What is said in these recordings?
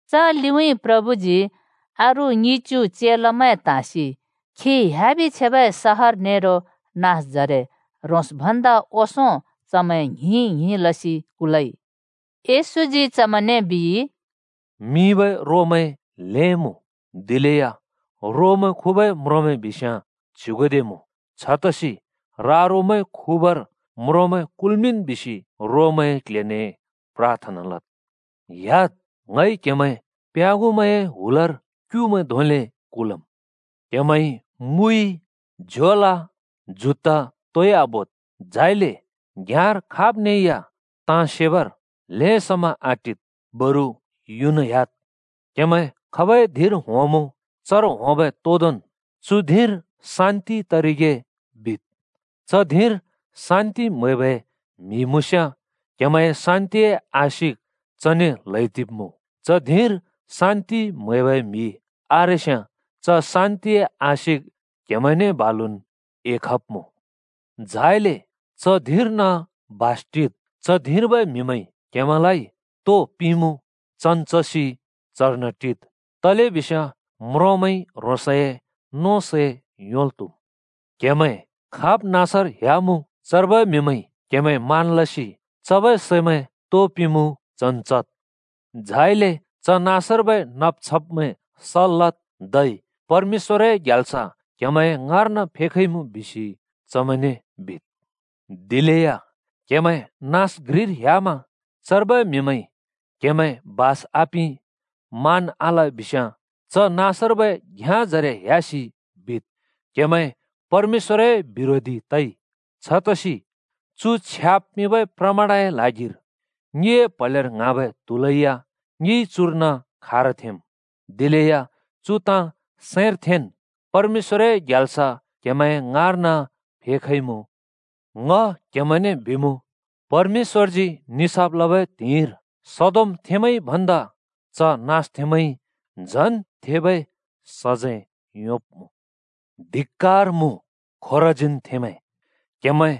च लिउँइँ प्रभुजी अरू ङिच्‍यु चेलामैं त्हाँसि खी ह्‍याबि छेबै सहर नेरो नाँसजरे ह्रोंस् भन्दा ओंसों चमैं ङ्हिं-ङ्हिं लसि कुलइ। येशूजी चमैंने बिइ, “मिंबै रोमैं ल्हें मुँ, दिलेया रोमैं खुबै म्रोंमैं बिस्याँ च्युगुदे मुँ। छतसि ‘रा-रोमैं खुबर म्रोंमैं कुल्मिंन्,’ बिसि रोमैंए क्‍ल्‍हेने प्राथना लद्। ह्‍याद्! ङइ क्‍हेमैं प्याँगुमैंए हुलर क्‍युमैं धोंले कुलम्। क्‍हेमैंइ मुइ, झोला, जुत्ता तोइ आबोद्। झाइले घ्‍याँर खाब्ने या ताँ सेबर ल्‍हें समा आटिद्, बरु युना ह्‍याद्। “क्‍हेमैं खाब् धिंर होंमुँ, चर होंबै तोदोंन् ‘चु धिंर शान्‍ति तरिगे’ बिद्। च धिंर शान्‍ति म्‍हैबै म्‍हि मुँस्‍याँ क्‍हेमैंए शान्‍तिए आशिक चने ल्‍हैदिब्‍मुँ। च धिंर शान्‍ति म्‍हैबै म्‍हि आरेस्‍याँ च शान्तिए आशिक क्‍हिमैंने बालुन् एखब्मुँ। झाइले च धिं घ्रिर्न बास टिद्। च धिंर्बै म्‍हिमैंइ क्‍हेमैंलाइ तो पिंमुँ चन् चसि चर्न टिद्। तलेबिस्याँ म्रोंमैंइ ह्रोंसए नों सै योंल् त्हुम्। क्हेमैं खाब् नाँसर ह्‍यामुँ चर्बै म्‍हिमैंइ क्‍हेमैं मान लसि चबै सेमैं तो पिंमुँ चन् चद्। झाइले च नाँसर्बै नब्-छब्मैं सल् लद्, धै ‘परमेश्‍वरए ग्याल्स क्‍हेमैंए ङाँर्न फेखइमुँ’ बिसि चमैंने बिद्। दिलेया क्हेमैं नाँस घ्रिर ह्‍यामा चर्बै म्‍हिमैंइ क्‍हेमैं बास आपिं, मान आल बिस्याँ च नाँसर्बै घ्‍याँजरे ह्‍यासि बिद्, ‘क्‍हेमैं परमेश्‍वरए बिरोधी तइ। छतसि चु छ्याब् पिंबै प्रमाणए ल्हागिर ङिए प्‍हलेर ङ्हाँबै त्‍हुलै या ङिइ चुर्न खारथेंम्। दिलेया चु ताँ सैंर थेंन् परमेश्‍वरए ग्याल्स क्‍हेमैंए ङाँर्न फेखइमुँ,’ बिद्। ङ क्‍हेमैंने बिमुँ, परमेश्‍वरजी निसाफ लबै त्हिंइर सदोमथेंमैंइ भन्दा च नाँसथेंमैंइ झन् थेबै सजैं योंब्‍मुँ। “धिक्‍कार मुँ खोराजीनथेंमैं! क्‍हेमैं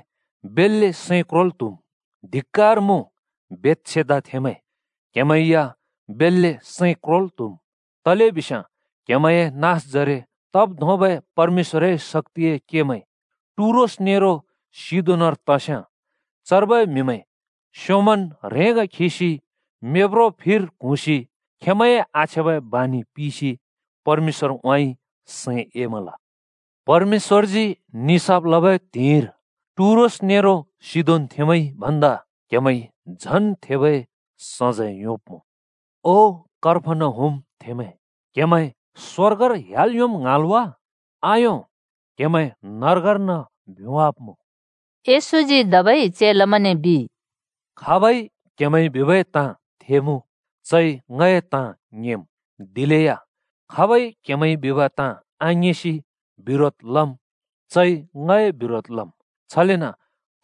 बेल्‍ले सैं क्रोल् त्‍‍हुम्! धिक्‍कार मुँ बेथसेदाथेंमैं, क्‍हेमैं या बेल्‍ले सैं क्रोल् त्‍‍हुम्! तलेबिस्याँ क्‍हेमैंए नाँसजरे तब् धोंबै परमेश्‍वरए शक्‍तिए केमैं टुरोस नेरो सिदोनर तस्‍याँ चर्बै म्‍हिमैं स्‍योंमन् ह्रेंगा खिसि मेब्रो फिर क्हुँसि खेंमैंए आछ्याँबै बानि पिसि परमेश्‍वरउँइँ सैं एमल। परमेश्‍वरजी निसाफ लबै त्हिंइर टुरोस नेरो सिदोनथेंमैंइ भन्दा क्‍हेमैंइ झन् थेबै सजैं योंब्‍मुँ। ओ कफर्नहुमथेंमैं! क्हेमैं स्वर्गर ह्‍याल् योंम् ङ्हाँल् वा? आयों! क्‍हेमैं नर्गर्न भ्‍योंवाब्‍मुँ।” येशूजी धबै चेलामैंने बिइ, “खाब‍इ क्‍हेमैंइ बिबै ताँ थेमुँ, चइ ङए ताँ थेम्। दिलेया खाबइ क्‍हेमैंइ बिब आङिंसि बिरोध लम्, चइ ङए बिरोध लम्। छलेन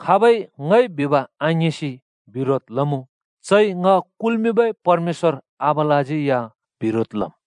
खाबइ ङइ बिब आङिंसि बिरोध लमुँ, चइ ङ कुल्‍मिंबै परमेश्‍वर आबालाज्यै या बिरोध लम्।”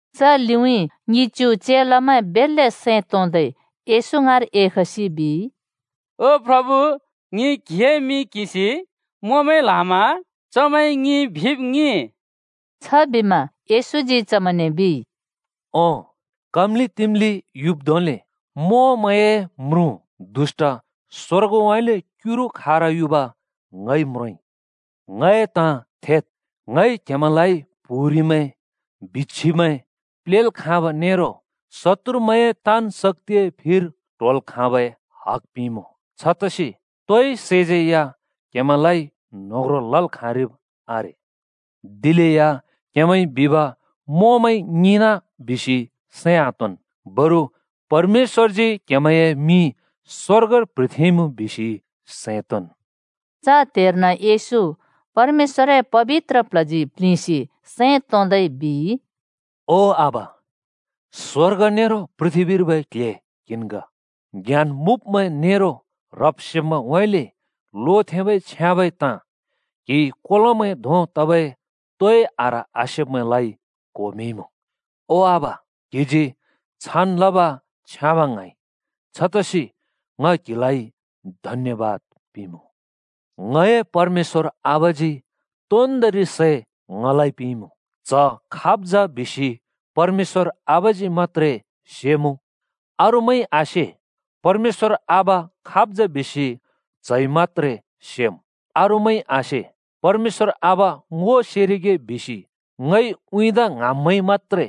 च लिउँइँ ङिच्यु चेलामैं बेल्‍ले सैं तोंदै येशू ङाँर एखसि बिइ, “ओ प्रभु, ङिइ क्‍हिए मिं किंसि मोंमैं ल्‍हामा चमैंइ ङिइ बिबै ताँ ङिंइ।” छबिमा येशूजी चमैंने बिइ, “ओं, काम्‍लि-तिम्‍लि युब् धोंले मोंमैंए म्रुँ दुष्‍ट स्‍वर्गउँइँले क्युरु खारयुब ङइ म्रोंइ। ङ‍ए ताँ थेद्! ङइ क्‍हेमैंलाइ प्‍हुरिमैं, बिच्‍छिमैं प्लेल् खाँब नेरो शत्तुरमैंए ताँन् शक्‍तिए फिर ट्होल् खाँबै हग पिंइमुँ। छतसि तोइ सैज्यै या क्‍हेमैंलाइ न्होह्रों लल् खाँरिब् आरे। दिलेया क्‍हेमैंइ बिब मोंमैंइ ङिंना बिसि सैं आतोंन्, बरु परमेश्‍वरजी क्‍हेमैंए मिं स्वर्गर प्‍ह्रिथेंइमुँ बिसि सैं तोंन्।” च त्‍हेर्न येशू परमेश्‍वरए पबित्र प्ल्हजी प्लिंसि सैं तोंदै बिइ, “ओ आबा, स्वर्ग नेरो पृथ्‍बीर्बै क्‍ल्‍हे क्हिन् ग, ज्ञान मुँब्‍मैं नेरो ह्रब्-सेब्मैंउँइँले लोथेंबै छ्याँबै ताँ कोलोमैं धों तबै तोइ आह्र आसेब्मैंलाइ क्‍हिइ क्होमिंइमुँ। ओ आबा, क्‍हिजी छान् लब छ्याँब ङ्हाँइ। छतसि ङ क्हिलाइ धन्यबाद पिंमुँ। “ङए परमेश्‍वर आबाजी तोन्दोंरि सै ङलाइ पिंइमुँ। च्‍ह खाब् जा बिसि परमेश्‍वर आबाजी मत्‍त्रे सेमुँ अरूमैंइ आसे, परमेश्‍वर आबा खाब् जा बिसि च्हइ मत्‍त्रे सेमुँ अरूमैंइ आसे। ‘परमेश्‍वर आबा ङो सेरिगे’ बिसि ङइ उँइँदा ङ्हाँब्मैंइ मत्‍त्रे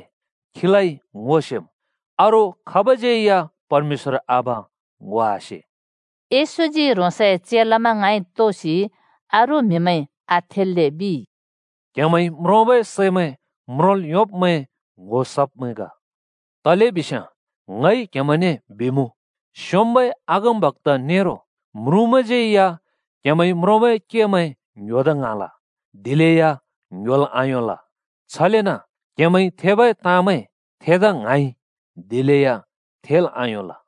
खीलाइ ङो सेम्, अरू खाबज्‍यै या परमेश्‍वर आबा ङो आसे।” येशूजी ह्रोंसए चेलामैं ङाँइ तोसि अरू म्हिमैंइ आथेल्‍ले बिइ, “क्‍हेमैंइ म्रोंबै सैमैं म्रोंल् योंब्मैं ङ्‍हो सब्मैं ग। तलेबिस्याँ ङ‍इ क्हेमैंने बिमुँ, स्‍योंम्‍बै अगमबक्‍ता नेरो म्रुँमैंज्यै या क्‍हेमैंइ म्रोंबै केमैं ङ्‍ह्‍योदा ङ्हाँल, दिलेया ङ्‍ह्‍योल् आयोंल। छलेन क्‍हेमैंइ थेबै ताँमैं थेदा ङ्हाँइ, दिलेया थेल् आयोंल।”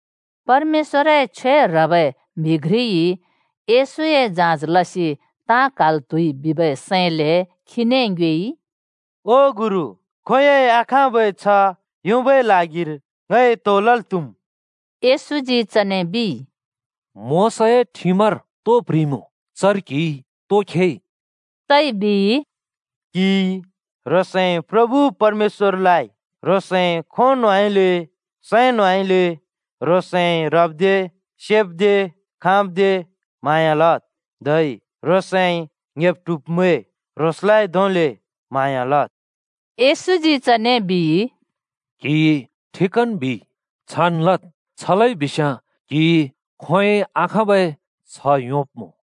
परमेश्‍वरए छ्वे ह्रबै म्‍हि घ्रिइ येशूए जाँच लसि ताँ क्हाल् त्हुइ बिबै सैंले खीने ङ्योएइ, “ओ गुरु, खोंयोंइ आखाँबै छ्ह योंबै ल्हागिर ङइ तो लल् त्‍हुम्?” येशूजी चने बिइ, “मोशाए ठिमर तो प्‍ह्रिइमुँ? चर क्‍हिइ तो खेइ?” चइ बिइ, “‘क्‍हिइ ह्रोंसए प्रभु परमेश्‍वरलाइ ह्रोंसए खों न्होंउँइँले, सैं न्होउँइँले, ह्रोंसइ ह्रब्दे, सेब्दे, खाँब्दे म्‍हाँया लद्, धै ह्रोंसए ङ्‍हेब-ट्हुब्मैं ह्रोंस धोंलेन् म्‍हाँया लद्।’” पेयेशूजी चने बिइ, “क्‍हिइ ठिकन् बिइ। छान् लद्, छ लइबिस्‍याँ क्‍हिइ खोंयोंइ आखाँबै छ्ह योंब्‍मुँ।”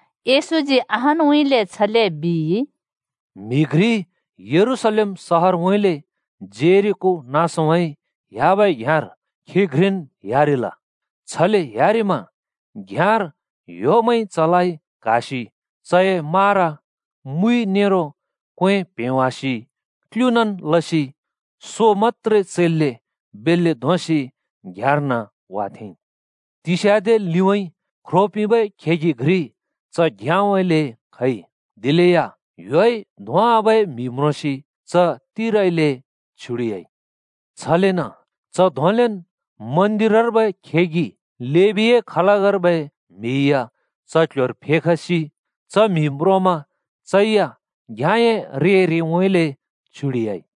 येशूजी अहानउँइँले छले बिइ, “म्‍हि घ्रि यरूशलेम सहरउँइँले जेरिको नाँसउँइँ ह्‍याबै घ्‍याँर खी घ्रिन् ह्‍यारिल। छले ह्‍यारिमा घ्‍याँर ह्‍योमैंइ चलाइ क्‍हासि चए मारा, मुइ, नेरो क्वें प्‍हेंवासि क्लुँनन् लसि सो मत्‍त्रे चैल्‍ले बेल्‍ले धोंसि घ्‍याँर्न वाथेंइ। तिस्याँदे लिउँइँ ख्रो पिंबै खेगि घ्रि च घ्‍याँउँइँले खइ। दिलेया ह्‍योइ धोंवाबै म्‍हि म्रोंसि च तिरइले छ्युडिह्‍याइ। छलेन च धोंलेन् मन्दिरर्बै खेगि लेबीए खलकर्बै म्हि या च क्‍ल्‍ह्‍योर फेखसि च म्‍हि म्रोंमा चै या घ्याँए रे रेउँइँले छ्युडिह्‍याइ।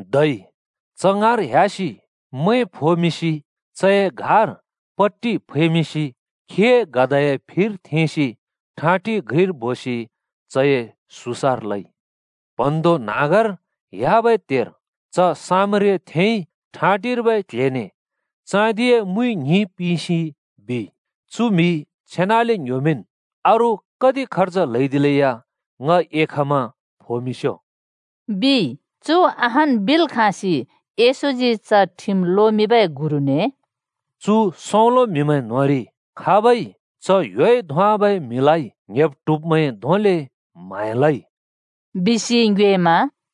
धै च ङाँर ह्‍यासि मैं फोमिंसि चए घार पट्टि फैमिंसि खीए गधाए फिर थेंसि ठाँटि घ्रिर बोसि चए सुसार लइ। प्‍हँन्हाँग्धों ह्‍याबै त्‍हेर च सामरियाथेंइ ठाँटिर्बै क्‍ल्‍हेने चाँदिए मुइ ङ्हिं पिंसि चु म्‍हि छेनले ङ्‍ह्‍योमिंन् अरू कति खर्ज ल्‍हौदिलेया ङ एखमा फोमिंस्‍यो,” बिइ। चु अहान् बिल् खाँसि येशूजी च ठिम लोमिंबै गुरुने “चु सौंलो म्हिमैं न्‍होंरि खाबइ च ह्‍योइ धोंवाबै म्‍हिलाइ ङ्‍हेब्-ट्हुब्मैं धोंले म्‍हाँया लइ?” बिसि ङ्योएमा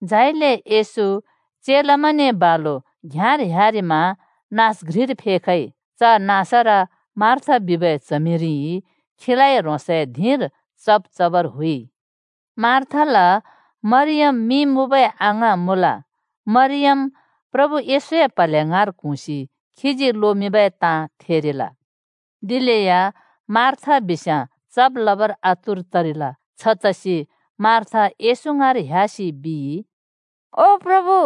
झाइले येशू चेलामैंने बालु घ्‍याँर ह्‍यारिमा नाँस घ्रिर फेखइ। च नाँसर मार्था बिबै च्हमिरिइ खीलाइ ह्रोंसए धिंर चब् चबर हुइ। मार्थाल मरियम मिं मुँबै अङाँ मुँल। मरियम प्रभु येशूए प्‍हले ङाँर क्हुँसि खीजी लोमिंबै ताँ थेरिल। दिलेया मार्था बिस्याँ चब् लबर आतुर तरिल। छतसि मार्था येशू ङाँर ह्‍यासि बिइ, “ओ प्रभु,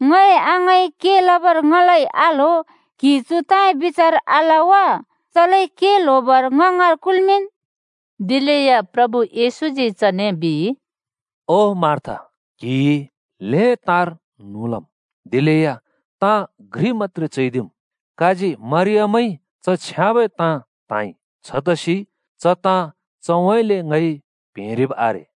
ङए अङाँइ के लबर ङलाइ आल्‍हो! क्‍हिइ चु ताँए बिचार आल वा? के ल्‍होब‍र च ङ ङाँर कुलमिन्।” दिलेया प्रभु येशूजी चने बिइ, “ओ, मार्था क्‍हिइ ल्‍हें ताँर न्हुँ लम्। दिलेया ताँ घ्रि मत्‍त्रे चैदिम्। काजी मरियमइ च छ्याँबै ताँ त्‍हाँइ। छतसि च ताँ चउँइँले ङइ प्हेंरिब् आरे।”